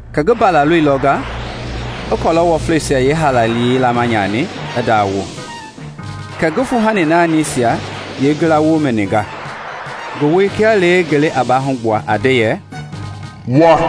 Kɛ ngi Mbalaloi lɔnga i kɔlɔ wɔfleisia yeehaalayei laama nyani i ndawo, kɛ ngi fuuhani naanisia yeengila wo mɛninga, ngi woi kia lee ngelei a baahugbuaa, a nde yɛ, “Wa!”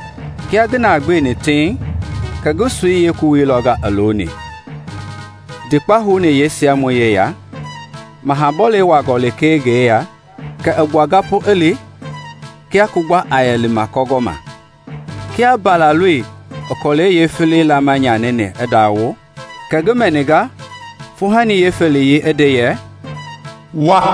Kia ngi na gbeni tiiŋ kɛ ngi soi yeekowei lɔnga looni, ndikpei houni yeesiamɔi yeya; maha bɔlei wuaangɔ lekee ngi yeya kɛ i gbuanga pu i li kia kugba a yɛ lima kɔ gɔma. Kia Mbalaloi i kɔlɛi yeefelei laama nyanini i ndawo, kɛ ngi mɛninga fuuhani yeefeleyei i nde yɛ, “Wa!”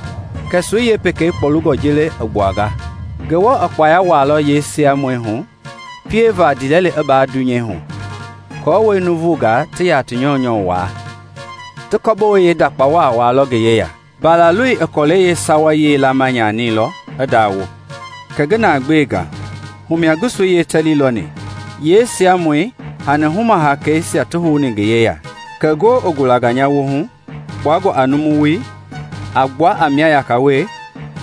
Kɛ soi yeepekei kpɔlungɔ jeele i gbuanga. Ngewɔ i kpaya wuailɔ yeesiamɔi hu pieva ndiilɛli i baa dunyeihu, aako nuuvungaa ti ya ti nyɔunyɔu waa; ti kɔ-bowei yeendakpa wa wuailɔ ngi yeya. Mbalaloi i kɔlɛi yeesawayei laama nyanilɔ i ndawo; kɛ ngi na gbenga, humia ngi soi yeetɛli lɔni, yeesiamɔi hani huma-hakeisia ti houni ngi yeya. Kɛ ngoo i gulanga nya wolihu kpuangɔ a numu woi a gbua a mia yaka we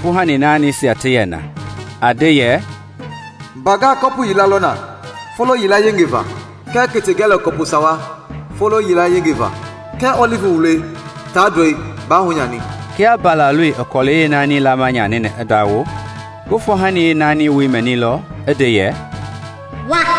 fuuhani naanisia ti yɛ na, a nde yɛ, “Mbangaa kɔpu yila lɔ na folo yila yenge va, kɛɛ kete ngɛlɛ kɔpu sawa folo yila yengei va. Kɛɛ ɔlivi wuloi taa ndɔi baa hunyani.” Kia Mbalaloi i kɔlɛi yeenaani laama nyanini i ndawo, ngi fuuhani yeenaaniyei wo mɛnilɔ i nde yɛ, “Wa!”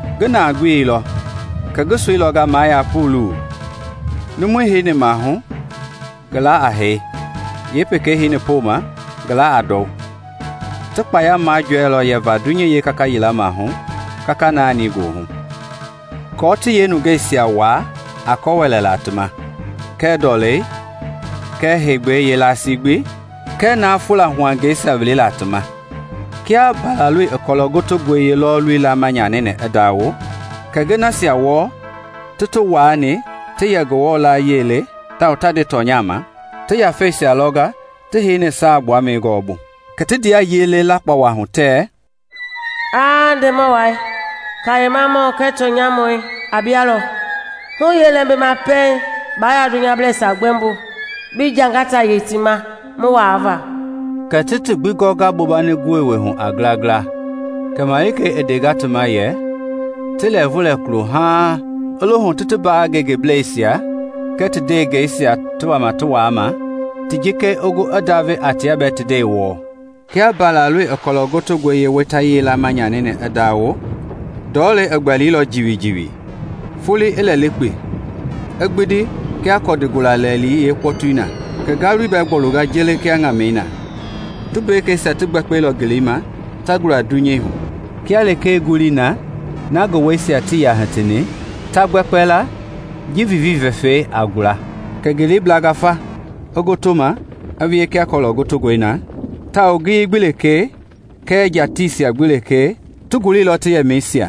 Ngi na gbeilɔ kɛ ngi soi lɔnga maa ya puulu, numui heini maahu ngi laa a Hee, yeepekei heini poma ngi laa a ndɔu. Ti kpaya majɔɛilɔ yɛva dunyei yeekaka yila maahu kaka naani goohu, kɔɔ ti yeenungeisia waa a kɔ wɛlɛla ti ma, kɛɛ ndɔlei, kɛɛ heegbei yeelasii gbi, kɛɛ na a fula huangɛisia wilila ti ma. Kia Mbalaloi i kɔlɔ gotongɔi yeelɔɔluyei laama nyanini i ndawo, kɛ ngi nasia wɔɔ ti ti waani ti yɛ Ngewɔ yie le tawao ta nde tɔnya ma, ti yafeisia lɔnga ti heini saagbuamɛi gɔɔbu. Kɛ ti ndea yele lakpawa hu tɛ, “Aa Ndemɔ wai, kayemamɔi kɛɛ tɔnyamɔi a bialɔ! Hu yeelɛmbima pɛiŋ baa yaa dunyableisia gbɛmbo bi jangata yei ti ma mu waa va?” Kɛ ti ti gbi gɔnga bombani gowei hu a ngila ngila; kɛ malikei i ndenga ti ma yɛ ti lɛɛvu lɛ kulo haaŋ i lohu ti ti mbaa ngengebleisia kɛɛ ndewengeisia ti wama ti waama ti jikei i gu i ndave a tia bɛɛ ti nde wɔɔ. Kia Mbalaloi i kɔlɔ gotongɔi yeeweitayei laama nyanini i ndawo, ndɔlei i gbɛlilɔ jiwijiwi, foloi i lɛlikpi i gbindi kia kɔndi gula lɛilɛi yeekpɔtui na, kɛ ngalui bɛɛ i gbɔlunga jeele kia ŋamɛi na. Tumbekeisia ti gbɛkpɛilɔ ngeleima ta gula dunyei hu kia lekee ngului na na ngi wuɛisia tii yaa hitini ta gbɛkpɛla ji viivii vɛfɛi a gula. Kɛ ngelei i blanga fa i gotoma i wie kia kɔlɔ gotongɔi na, tawao ngiyei gbi lekee kɛɛ tiisia gbi lekee ti guleilɔ ti yɛmɛisia.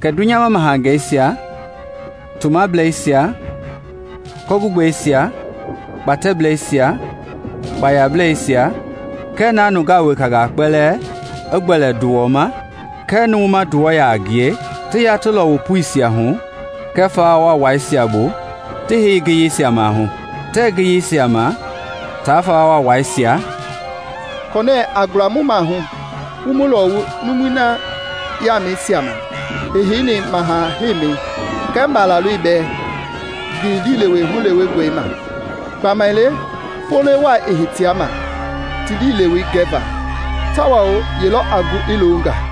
Kɛ dunyama mahangeisia, tomableisia, kɔ-gugbeisia, kpatɛbleisia, kpayableisia, kɛɛ na nungaa wekangaa kpɛlɛɛ i gbɛlɛ nduwɔ ma kɛɛ numu ma nduwɔ yaa ngie, ti ya ti lɔwu puisia hu kɛɛ fawa waawaisia bu ti heini ngiyeisia maahu. Tɛ ngiyeisia ma taa fawa waawaisia, “kɔnɛ a gula mu mahu wu mu lɔwu numui na yaamɛisia ma i heini maha heimi kɛɛ Mbalaloi bɛɛ ngi liilewe hulewengɔi ma! Gbamaile, folo wai i hitea ma ti liilewei gɛ va, tawao yelɔ a gu i loonga?”